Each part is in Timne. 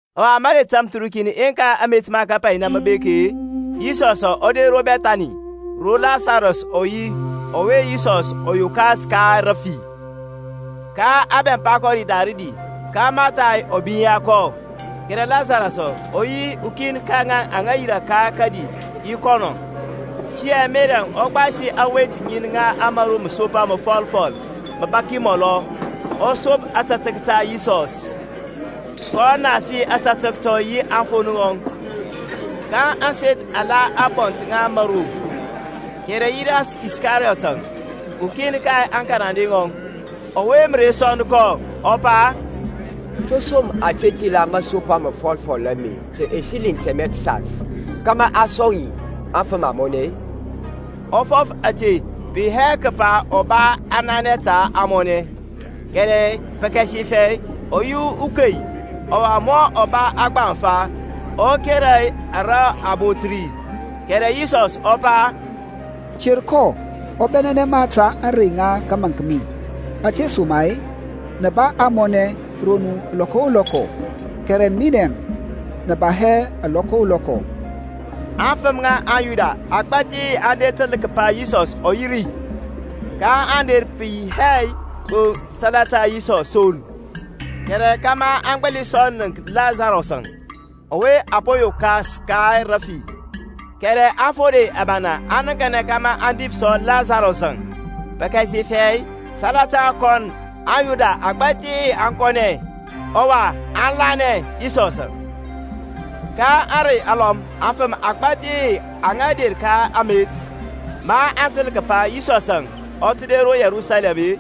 Ɔwa mərey tamthərukin yeŋka amet ma kapainɛ mə bek-e, Yisɔsȧŋ ɔ der ro Bɛthani, ro Lasarɔs ɔ yi, ɔwe Yisɔs ɔ yokas ka rafi. Ka a bɛmpa kɔ ri da rədi; ka Martha-əŋ ɔ binya kɔ, kɛrɛ Lasarɔs-əŋ ɔ yi ukin ka ŋaŋ aŋa yirȧ ka kədi yi kɔnɔ. Tiyȧŋ Merɛŋ ɔ gbasi awet ŋin ŋa mȧro məsopa məfɔlfɔl, məbaki mɔlɔ, ɔ sop ȧtȧtək ta Yisɔs, kɔ nasi ȧtȧtək tɔŋ yi aŋfon ŋɔŋ: ka ȧŋseth aŋ la ȧŋbɔnt ŋa ȧmȧro. Kɛrɛ Yudas Iskariyɔtȧŋ, ukin ka aŋkarande ŋɔŋ, ɔwe mə re sɔnd kɔ, ɔ pa, To som a te thila masopa məfɔlfɔl ame ta ɛsiliŋ tɛmɛ təsas, kȧmȧ a sɔŋ yi aŋfəm amɔnɛ-e? Ɔ fɔf ȧte pə yi hɛ kəpa ɔ ba ananɛ ta ȧŋmɔnɛ, kɛrɛ pəkasifɛ ɔ yi ukei, ɔwa mɔ ɔ ba aŋgbaŋfa, ɔ kera ara a bot ri. Kɛrɛ Yisɔsȧŋ ɔ pa, Ter kɔ: ɔ bɛnɛnɛ ma ta ȧŋrey ŋa kəmȧnk mi. Ȧtesoma-e nə ba ȧŋmɔnɛ ro nu lɔkɔ o lɔkɔ, kɛrɛ minɛŋ nə ba hɛ lɔkɔ o lɔkɔ. Aŋfəm ŋa aŋYuda agbȧthi aŋ təl kəpa Yisɔsȧŋ ɔ yi ri: kaŋ der pə yi hɛ gbo salata Yisɔs son, kɛrɛ kȧmȧ aŋ gbəli sɔ nənk Lasarɔs-əŋ, ɔwe ɔ po yokas ka rəfi. Kɛrɛ aŋfode abana aŋ nəŋkanɛ kȧmȧ aŋ dif sɔ Lasarɔs-əŋ; pəkasifɛ salata kɔnɔ aŋYuda agbȧthi aŋ kɔnɛ, ɔwa aŋ lanɛ Yisɔs. Ka ȧŋrey alɔm aŋfəm agbȧthi aŋa der ka amet, ma aŋ təl kəpa Yisɔsȧŋ ɔ tə der ro Yerusalɛm-e,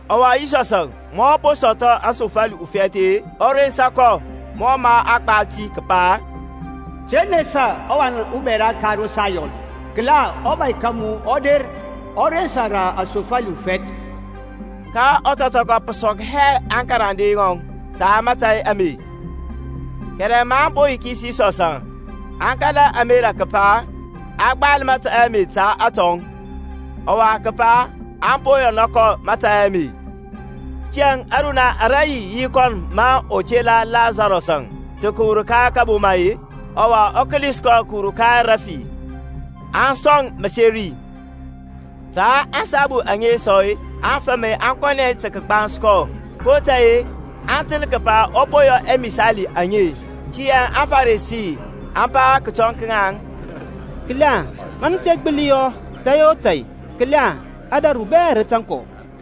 Ɔwa Yisɔsȧŋ, ma ɔ po sɔthɔ asofali ufɛth-e, ɔ rensa kɔ; mɔ mə a gbal ti kəpa, Te nesa, ɔwan ubɛra ka ro Sayɔn: kəla, ɔBȧy ka mu ɔ der, ɔ rensa rə asofali ufɛth. Ka ɔtɔtɔkɔ pə sɔk hɛ aŋkarande ŋɔŋ ta mȧtȧy ame: kɛrɛ ma a po yikis Yisɔsȧŋ aŋ kala ȧmerȧ kəpa a gbal mȧtȧy ame ta atɔŋ, ɔwa kəpa aŋ po yɔna kɔ mȧtȧy ame. Tiyȧŋ ȧruniya ara yi yi kɔn ma ɔ tela Lasarɔs-əŋ tə kəwur ka kaboma-e, ɔwa ɔ kəlis kɔ kəwur ka rəfi, aŋ sɔŋ məseri. Ta ȧŋsabu aŋe sɔ aŋfəm aŋ kɔnɛ tə kəgbans kɔ, kotȧy-e aŋ təl kəpa ɔ po yɔ amisali aŋe. Tiyȧŋ aŋFarisi aŋ pa kətɔŋ ka ŋaŋ, Kəla ma nə te gbəli yɔ tȧy o tȧy, kəla ȧdȧru bɛ rə tȧŋ kɔ.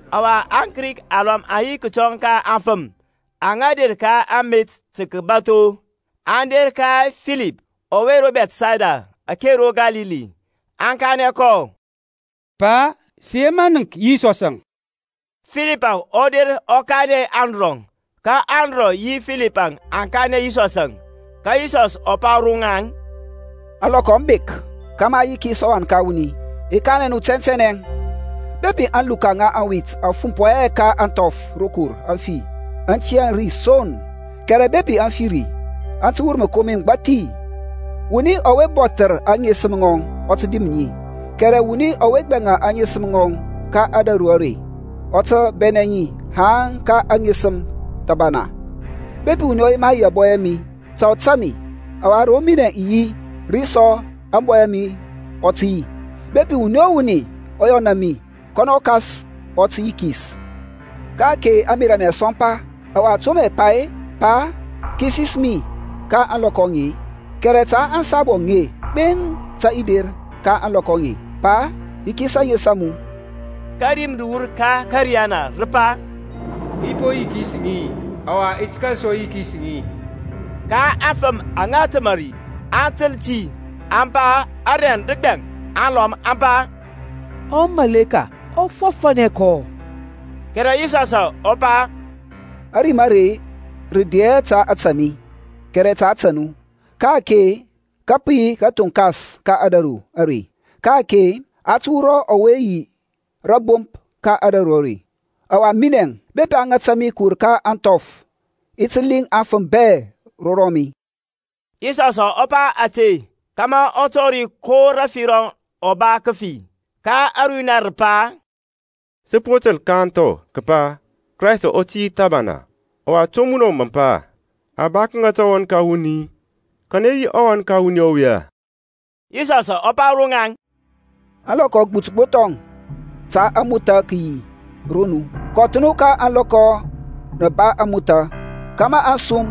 Ɔwa aKrik alɔm aŋ yi kətɔŋ ka aŋfəm aŋa der ka amet tə kəbatho. Aŋ der ka Filip, ɔwe ro Bɛthsayda ake ro Kalili, aŋ kanɛ kɔ, Pa, sə yema nənk Yisɔsȧŋ. Filipȧŋ ɔ der ɔ kanɛ Andrɔŋ, ka Andrɔŋ yi Filipȧŋ aŋ kanɛ Yisɔsȧŋ. Ka Yisɔsȧŋ ɔ pa ro ŋaŋ, Ȧŋlɔkɔ aŋ bek kȧmȧ a yikis ɔWan ka wuni. I kanɛ nu tɛntɛnɛ, Bepi ȧŋluka ŋa awit aŋ fumpɔ hɛ ka ȧŋthɔf rokor aŋ fi, aŋ tiyȧ ri son: kɛrɛ bepi aŋ fi ri, aŋ tə wur məkomi məgbathi. Wuni ɔwe bɔthər aŋesəm ŋɔŋ ɔ tə dim ŋi, kɛrɛ wuni ɔwe gbɛŋa aŋesəm ŋɔŋ ka ȧdȧru are ɔ tə bɛnɛ ŋi haŋ ka aŋesəm thəbana. Bepi wuni ɔ yema yi ȧbɔy a mi, ta ɔ tȧŋ mi; ɔwa ro minɛ i yi, ri sɔ ȧŋbɔy a mi ɔ tə yi: bepi wuni o wuni ɔ yɔna mi, kɔnɔ ɔKas mɔ yikis. Ka-ake ȧŋmerȧ a mi aŋ sɔmpa; ɔwa to mə i pa-e? Pa, kisis mi ka ȧŋlɔkɔ aŋe-e? Kɛrɛ ta ȧŋsabu aŋe gbeŋ tə i der ka ȧŋlɔkɔ aŋe. Pa, yikis ȧŋes a mu. Ka rim rə wur ka ȧkȧriyana, rə pa, I pɔ yikis ŋi, ɔwa i ti kȧl sɔ yikis ŋi. Ka aŋfəm aŋa təmȧ ri, aŋ təl ti, aŋ pa arɛŋ də gbɛŋ; alɔm aŋ pa, Umȧleka ɔ fɔfȧnɛ kɔ. Kɛrɛ Yisɔsȧŋ ɔ pa, Ȧrim are rə de hɛ ta ȧtȧ mi, kɛrɛ ta ȧtȧ nu. Ka-ake ka pə yi kathoŋkas ka ȧdȧru are; ka-ake a tə wurɔ ɔwe yi rȧbomp ka ȧdȧru are. Ɔwa minɛŋ, bepi a ŋata mi kəwur ka ȧŋthɔf i ti liŋ aŋfəm bɛ ro rɔmi. Yisɔsȧŋ ɔ pa ȧte, kȧmȧ ɔ tɔri ko rəfi ɔ ba kəfi. Ka ȧruniya rə pa, Sə po təl ka ȧŋthɔ kəpa Kraystȧŋ ɔ tiyȧ thəbana: ɔwa to munɔŋ mə pa, A ba kəŋata ɔWan ka wuni-e? Kanɛ yi ɔWan ka wuni ɔwe-e? Yisɔsȧŋ ɔ pa ro ŋaŋ, Alɔkɔ agbut gbo thɔŋ ta ȧŋmothȧ kəyi ro nu. Kɔth nu ka ȧŋlɔkɔ nə ba ȧŋmothȧ, kȧmȧ ȧŋsum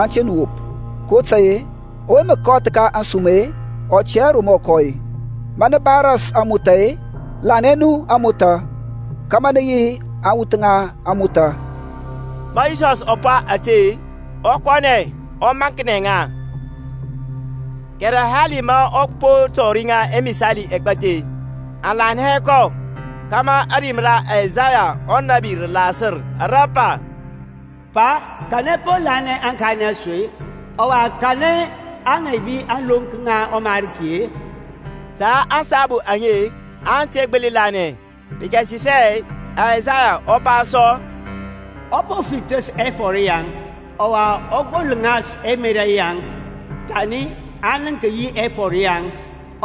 aŋ te nu wop: kotȧy-e ɔwe mə kɔth ka ȧŋsum-e, ɔ tɛ hɛ ro mɔ kɔ-e. Ma nə ba ras ȧŋmothȧ-e, lanɛ nu ȧŋmothȧ kȧmȧ nə yi awuth ŋa ȧŋmothȧ. Ma Yisɔsȧŋ ɔ pa ȧte, ɔ kɔnɛ, ɔ maŋknɛ ŋa. Kɛrɛ hali ma ɔ po tɔri ŋa ɛmisali ɛgbathi, aŋ lanɛ hɛ kɔ: kȧmȧ ȧrim ra Isaya ɔnȧbi rə lasər, ara pa, Pa, kanɛ po lanɛ aŋkanɛ a su-e? Ɔwa ka kanɛ a ŋaibi ȧŋlonk ŋa ɔMarki e? Ta ȧŋsabu aŋe aŋ te gbəli lanɛ, pəkasifɛ Aysayaŋ ɔ pa sɔ, Ɔ po fithəs ɛfɔr yaŋ, ɔwa ɔ gbolŋas ɛmerȧ yaŋ; Thani aŋ nənk yi ɛfɔr yaŋ,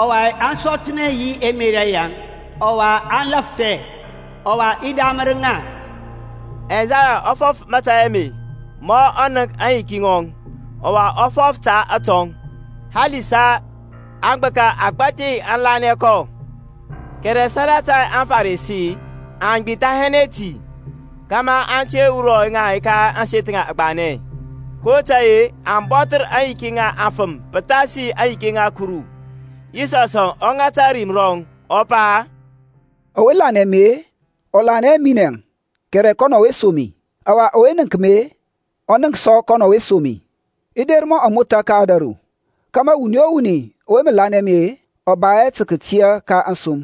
ɔwa aŋ sɔthnɛ yi ɛmerȧ yaŋ, Ɔwa aŋ lafthɛ, Ɔwa i damər ŋa. Aysaya ɔ fɔf mȧtȧy ame ma ɔ nənk aŋyiki ŋɔŋ, ɔwa ɔ fɔf ta atɔŋ. Halisa agbəka agbȧthi aŋ lanɛ kɔ: kɛrɛ salata aŋFarisi aŋ gbithanɛ hɛ ti, kȧmȧ a te wurɔ ŋa ka ȧŋseth agbanɛ: kotȧy-e aŋ bɔthər aŋyiki ŋa aŋfəm pəthasi aŋyiki ŋa Kuru. Yisɔsȧŋ ɔ ŋata ȧrim rɔŋ, ɔ pa, Ɔwe lanɛ mi-e, ɔ lanɛ hɛ minɛŋ, kɛrɛ kɔnɔ ɔwe som mi. Ɔwa ɔwe nənk mi-e, ɔ nənk sɔ kɔnɔ ɔwe som mi. I der mɔ amotha ka ȧdȧru, kȧmȧ wuni o wuni ɔwe mə lanɛ mi-e, ɔ ba hɛ tə kətia ka ȧŋsum.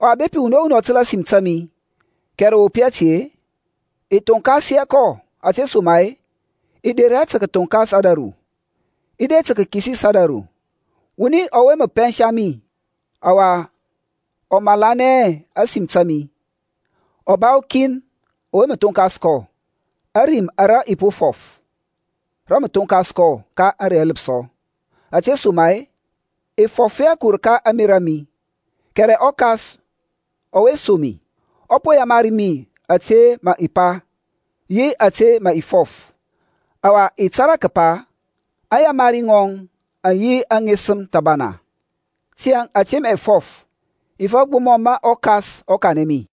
Ɔwa bepi wuni o wuni ɔ təl ȧsim ta mi, kɛrɛ ɔ wop hɛ ti-e, i thonkas hɛ kɔ: ȧtesoma-e i de hɛ tə kəthoŋkas ȧdȧru, i der tə kəkisis ȧdȧru. Ɔwuni ɔwe mə pɛnsa mi, ɔwa ɔ malanɛ hɛ ȧsim ta mi, ɔ ba ukin ɔwe mə thonkas kɔ; ȧrim ara i po fɔf, rə mə thonkas kɔ ka ȧŋrey aləpsɔ. Ȧtesoma-e, i fɔf hɛ kəwur ka ȧŋmerȧ a mi; kɛrɛ ɔKas ɔwe som mi, ɔ po yamari mi ȧte mə i pa, yi ȧte mə i fɔf. Ɔwa i tȧrȧ kəpa aŋyamari ŋɔŋ aŋ yi aŋesəm thəbana; tiyȧŋ ȧte mə i fɔf, i fɔf gbo mɔ mə ɔKas ɔ kanɛ mi.